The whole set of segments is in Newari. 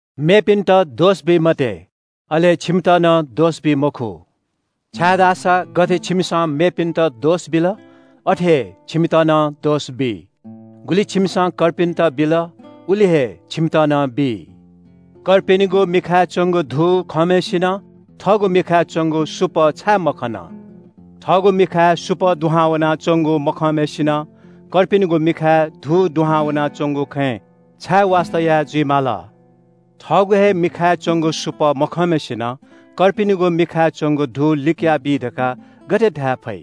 “मेपिन्‍त दोष बी मते, अले छिमित नं दोष बी मखु। छाय्‌धाःसा गथे छिमिसं मेपिन्‍त दोष बिल, अथे हे छिमित नं दोष बी। गुलि छिमिसं कर्पिन्‍त बिल, उलि हे छिमित नं बी। “छिमि किजाया मिखाय् च्‍वंगु धू खंम्‍हय्‌सिनं थःगु मिखाय् च्‍वंगु सुपः छाय् मखन? थःगु मिखाय् सुपः दुहां वनाच्‍वंगु मखंम्‍हय्‌सिनं छिमि किजाया मिखाय् धू दुहां वनाच्‍वंगु खँय् छाय् वास्‍ता याः जुइ माल? थःगु हे मिखाय् च्‍वंगु सुपः मखंम्‍हय्‌सिनं छिमि किजाया मिखाय् च्‍वंगु धू लिकयाबी धकाः गथे धाये फइ?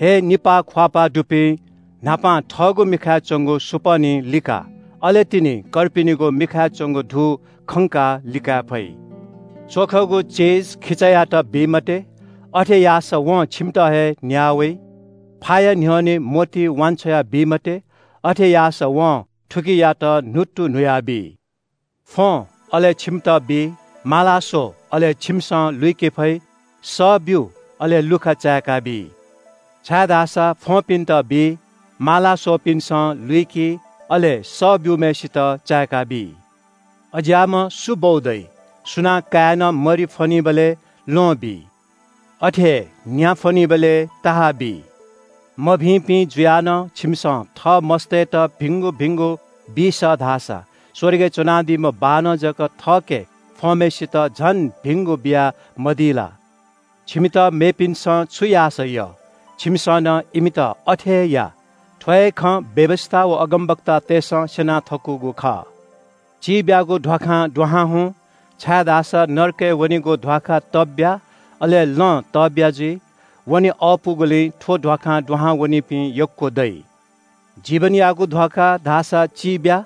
हे निपाः ख्‍वाःपाः दुपिं, न्‍हापां थःगु मिखाय् च्‍वंगु सुपः निं लिका। अले तिनि कर्पिनिगु मिखाय् च्‍वंगु धू खंकाः लिकाये फइ। “च्‍वखगु चिज खिचायात बी मते, अथे याःसा वं छिमित हे न्‍याः वइ। फाया न्‍ह्यःने मोती वान्‍छ्वया बी मते, अथे याःसा वं थुकियात न्‍हुत्तु न्‍हुयाबी। “फ्‍वँ, अले छिमित बी, माला स्‍व, अले छिमिसं लुइके फइ, सः ब्‍यु, अले लुखा चाय्‌काबी। छाय्‌धाःसा फ्‍वंपिन्‍त बी, माला स्‍वःपिन्‍सं लुइकी, अले सः ब्‍यूम्‍हय्‌सित चाय्‌काबी। “अज्‍याःम्‍ह सु बौ दइ? सुनां काय्‌नं मरि फ्‍वनीबलय् ल्‍वहं बी? अथे हे न्‍या फ्‍वनीबलय् सर्प बी? मभिंपिं जुयाः नं छिमिसं थः मस्‍तय्‌त भिंगु भिंगु बी सः धाःसा स्‍वर्गय् च्‍वनादीम्‍ह बाःनं जक थःके फ्‍वंम्‍हय्‌सित झन भिंगु बियामदी ला? “छिमित मेपिन्‍सं छु याःसा यः छिमिसं नं इमित अथे हे या। थ्‍व हे खँ व्‍यवस्‍था व अगमवक्तातय्‌सं स्‍यना थकूगु खः। “चिब्‍यागु ध्‍वाखां दुहां हुँ, छाय्‌धाःसा नरकय् वनीगु ध्‍वाखा तब्‍या, अले लँ तब्‍या जुइ। वने अःपुगुलिं थ्‍व ध्‍वाखां दुहां वनीपिं यक्‍व दइ। जीवनयागु ध्‍वाखा धाःसा चिब्‍या,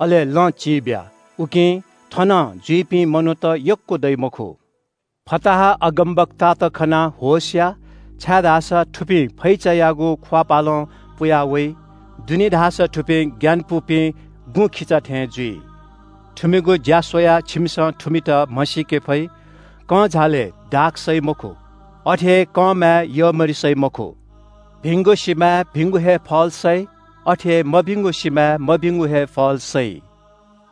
अले लँ चिब्‍या। उकिं थनं जुइपिं मनूत यक्‍व दइ मखु। “फताहा अगमवक्तात खनाः होश या, छाय्‌धाःसा थुपिं फैचायागु ख्‍वाःपालं पुया वइ। दुनें धाःसा थुपिं ग्‍यानापुपिं गुँखिचा थें जुइ। थुमिगु ज्‍या स्‍वयाः छिमिसं थुमित म्‍हसीके फइ। कंझालय् दाख सइ मखु। अथे हे कंमाय् यःमरि सइ मखु। भिंगु सिमाय् भिंगु हे फल सइ। अथे हे मभिंगु सिमाय् मभिंगु हे फल सइ।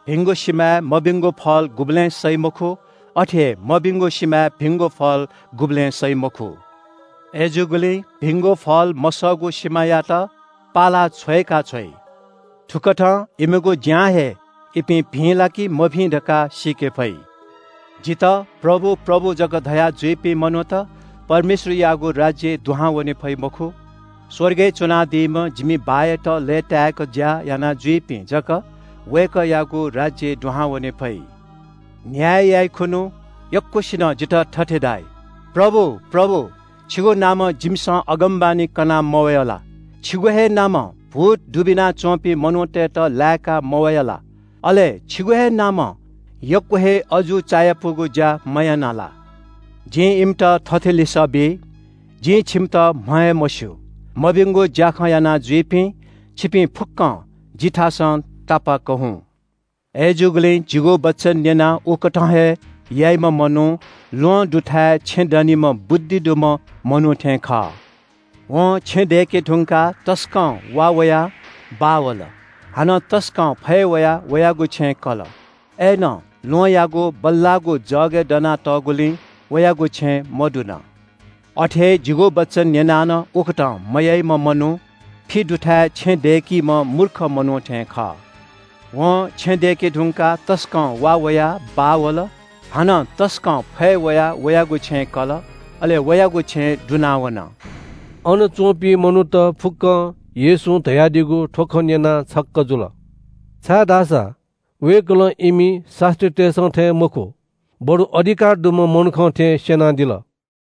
भिंगु सिमाय् मभिंगु फल गुबलें सइ मखु। अथे हे मभिंगु सिमाय् भिंगु फल गुबलें सइ मखु। अय्‌जूगुलिं भिंगु फल मसःगु सिमायात पालाः छ्वय्‌काछ्वइ। थुकथं इमिगु ज्‍यां हे इपिं भिं ला कि मभिं धकाः सीके फइ। “जितः ‘प्रभु, प्रभु’ जक धयाजुइपिं मनूत परमेश्‍वरयागु राज्‍यय् दुहां वने फइ मखु। स्‍वर्गय् च्‍वनादीम्‍ह जिमि बाःयात लय्‌तायेक ज्‍या याना जूपिं जक वय्‌कःयागु राज्‍यय् दुहां वने फइ। न्‍याय याइखुन्‍हु यक्‍वसिनं जितः थथे धाइ – ‘प्रभु, प्रभु, छिगु नामं जिमिसं अगमवाणी कना मवया ला? छिगु हे नामं भूत दुबिना च्‍वंपिं मनूतय्‌त लाय्‌का मवया ला? अले छिगु हे नामं यक्‍व हे अजू चायापुगु ज्‍या मयाना ला?’ जिं इमित थथे लिसः बी – जिं छिमित म्‍ह हे मस्‍यू। मभिंगु ज्‍याखँ यानाजुइपिं, छिपिं फुक्‍कं जिथासं तापाक्‍क हुँ। “अय्‌जूगुलिं जिगु वचन न्‍यनाः उकथं हे याइम्‍ह मनू ल्‍वहं दुथाय् छेँ दनीम्‍ह बुद्धि दुम्‍ह मनू थें खः। वं छेँ दय्‌के धुंकाः तसकं वा वयाः बाः वल। हानं तसकं फय् वयाः वयागु छेँय् कल। अय्‌नं ल्‍वहंयागु बल्‍लाःगु जगय् दनातःगुलिं वयागु छेँ मदुन। अथे हे जिगु वचन न्‍यनाः नं उकथं मयाइम्‍ह मनू फि दुथाय् छेँ दय्‌कीम्‍ह मूर्ख मनू थें खः। वं छेँ दय्‌के धुंकाः तसकं वा वयाः बाः वल। हानं तसकं फय् वयाः वयागु छेँय् कल। अले वयागु छेँ दुनावन।” अन च्‍वंपिं मनूत फुक्‍कं येशूं धयादीगु थ्‍व खँ न्‍यनाः छक्‍क जुल। छाय्‌धाःसा वय्‌कलं इमि शास्‍त्रीतय्‌सं थें मखु, बरु अधिकार दुम्‍ह मनुखं थें स्‍यनादिल।